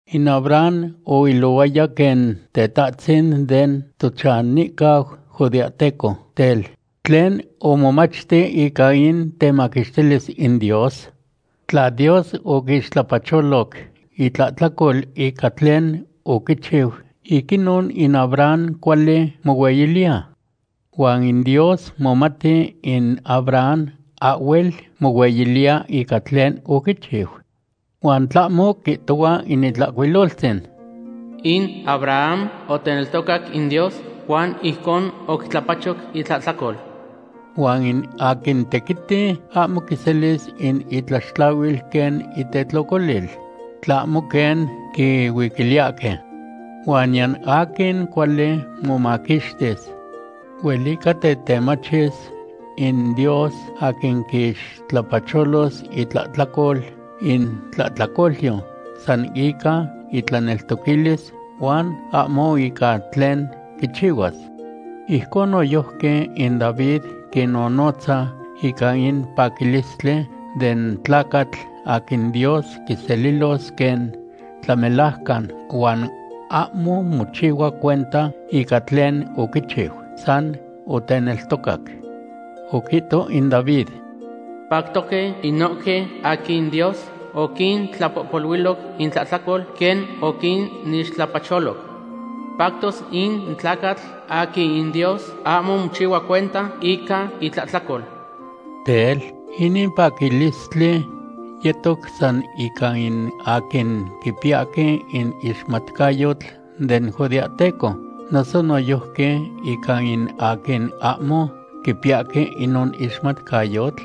In Abraham oilohuaya quen tetahtzin den tochanihcau judeahteco. Tel, ¿tlen omomachti ica in temaquixtilis in Dios? Tla Dios oquixtlapacholoc itlahtlacol ica tlen oquichiu, ic inon in Abraham cuali mohueyiliya. Huan in Dios momati in Abraham ahhuel mohueyiliya ica tlen oquichiu. Huan tlahmo quihtohua in Itlahcuiloltzin: “In Abraham oteneltocac in Dios, huan ijcon oquitlapachoc itlahtlacol.” Huan in aquin tequiti ahmo quiselis in itlaxtlahuil quen itetlocolil, tlahmo quen quihuiquiliyahque. Huan niyan aquin cuali momaquixtis. Huelica tetemachis in Dios aquin quixtlapacholos itlahtlacol in tlahtlacolyo san ica itlaneltoquilis, huan ahmo ica tlen quichihuas. Ijcon noyojqui in David quinnonotza ica in paquilistli den tlacatl aquin Dios quiselilos quen tlamelajcan huan ahmo mochihua cuenta ica tlen oquichiu, san oteneltocac. Oquihto in David: Pactoque inohque aquin Dios oquintlapohpoluiloc intlahtlacol quen oquinixtlapacholoc. Pactos in tlacatl aquin in Dios ahmo mochihua cuenta ica itlahtlacol. Tel, ¿inin paquilistli yetos san ica in aquin quipiyahque in ixmatcayotl den judeahteco, noso noyojqui ica in aquin ahmo quipiyahque inon ixmatcayotl?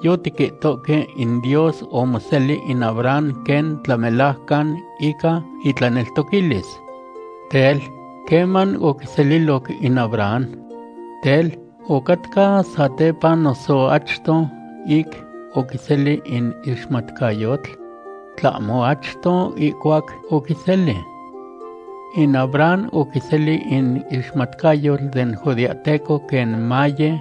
Yotiquihtoque in Dios omoseli in Abraham quen tlamelajcan ica itlaneltoquilis. Tel, ¿queman oquiseliloc in Abraham? Tel, ¿ocatca satepa noso achto ic oquiseli in ixmatcayotl? ¿Tlahmo achto ihcuac oquiseli? In Abraham oquiseli in ixmatcayotl den judeahteco quen maye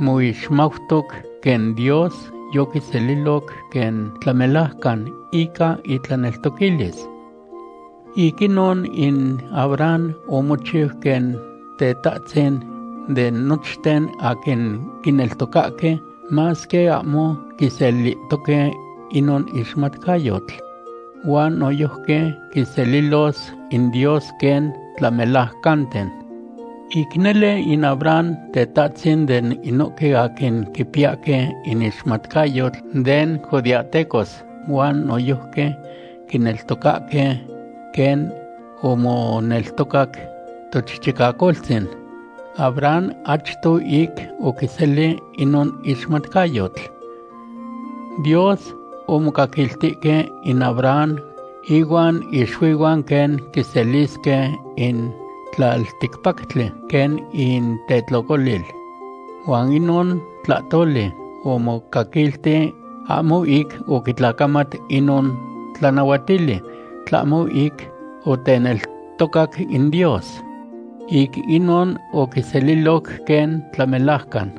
moixmautoc quen Dios yoquiseliloc quen tlamelajcan ica itlaneltoquilis. Ic inon in Abraham omochiu quen tetahtzin de nochten aquin quineltocahque, masque ahmo quiselihtoque inon ixmatcayotl. Huan noyojqui quinselilos in Dios quen tlamelajcanten. Ic nele in Abraham tetahtzin den inohque aquin quipiyahque in ixmatcayotl den judeahtecos huan noyojqui quineltocahque quen omoneltocac tochichicacoltzin Abraham achto ic oquiseli inon ixmatcayotl. Dios omocaquiltihque in Abraham ihuan ixuihuan quen quiselisque in tlalticpactli quen intetlocolil. Huan inon tlahtoli omocaquilti ahmo ic oquitlacamat inon tlanahuatili, tlahmo ic oteneltocac in Dios. Ic inon oquiseliloc quen tlamelajcan.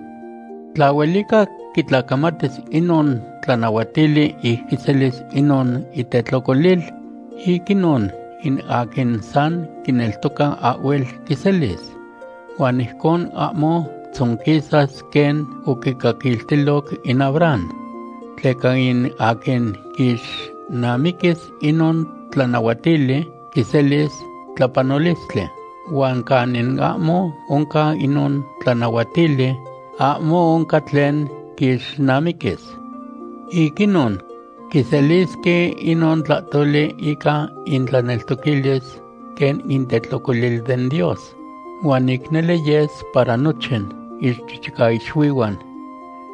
Tla huelica quitlacamatis inon tlanahuatili ic quiselis inon itetlocolil, ic inon in aquin san quineltoca ahhuel quiselis. Huan ijcon ahmo tzonquisas quen oquicaquiltiloc in Abraham. Tleca in aquin quixnamiquis inon tlanahuatili quiselis tlapanolistli, huan canin ahmo oncan inon tlanahuatili, ahmo oncan tlen quixnamiquis. Ic inon, quiselisque inon tlahtoli ica intlaneltoquilis quen intetlocolil den Dios, huan ic nele yes para nochin ichichicaixuihuan.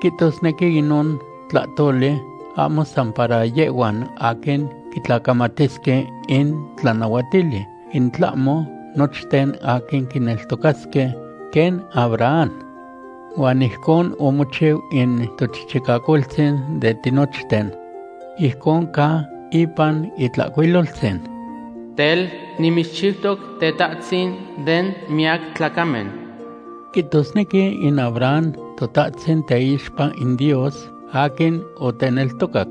Quihtosnequi inon tlahtoli ahmo san para yehhuan aquin quitlacamatisque in tlanahuatili, in tlahmo nochten aquin quineltocasque quen Abraham. Huan ijcon omochiu in tochichicacoltzin den tinochten. Ijcon ca ipan Itlahcuiloltzin: “Tel, nimitzchiutoc tetahtzin den miyac tlacamen.” Quihtosnequi in Abraham totahtzin teixpa in Dios aquin oteneltocac.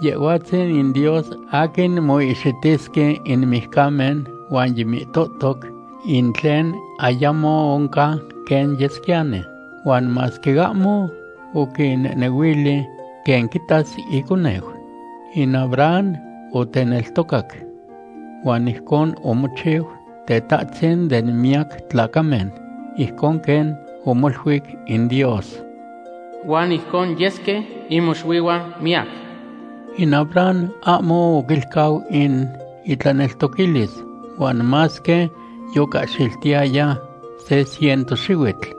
Yehhuatzin in Dios aquin moihxitisque in mijcamen huan yimihtohtoc in tlen ayamo oncan quen yesquiyani. Huan masque ahmo oquinehnehuili quen quitas iconeu, in Abraham oteneltocac. Huan ijcon omochiu tetahtzin de miyac tlacamen, ijcon quen omoluic in Dios: “Huan ijcon yesque in moxuihuan miyac.” In Abraham ahmo oquilcau in itlaneltoquilis huan masque yocahxiltihtaya se ciento xihuitl.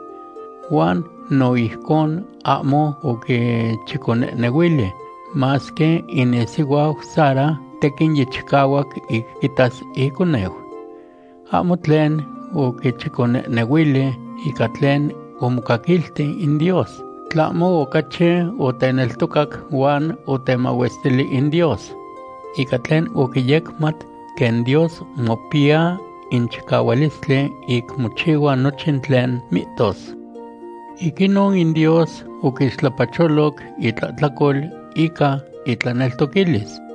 Huan no ijcon ahmo oquichiconehnehuili, masque in isihuau Sara tequin yichicahuac ic quitas iconeu. Ahmo tlen oquichiconehnehuili ica tlen omocaquilti in Dios, tlahmo ocachi oteneltocac huan otemahuestili in Dios. Ica tlen oquiyecmat quen Dios mopiya in chicahualistli ic mochihua nochin tlen mihtos. Ic inon in Dios oquixtlapacholoc itlahtlacol ica itlaneltoquilis.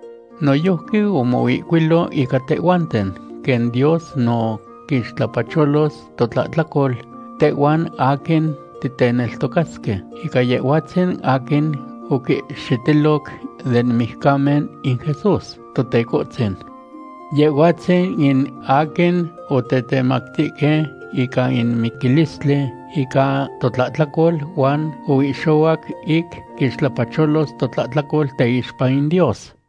Noyojqui omoihcuilo ica tehhuanten, quen Dios no quixtlapacholos totlahtlacol tehhuan aquin ticneltocasque ica Yehhuatzin aquin oquihxitiloc den mijcamen in Jesús, Totecohtzin. Yehhuatzin in aquin otetemactihque ica in miquilistli ica totlahtlacol huan oihxohuac ic quixtlapacholos totlahtlacol teixpa in Dios.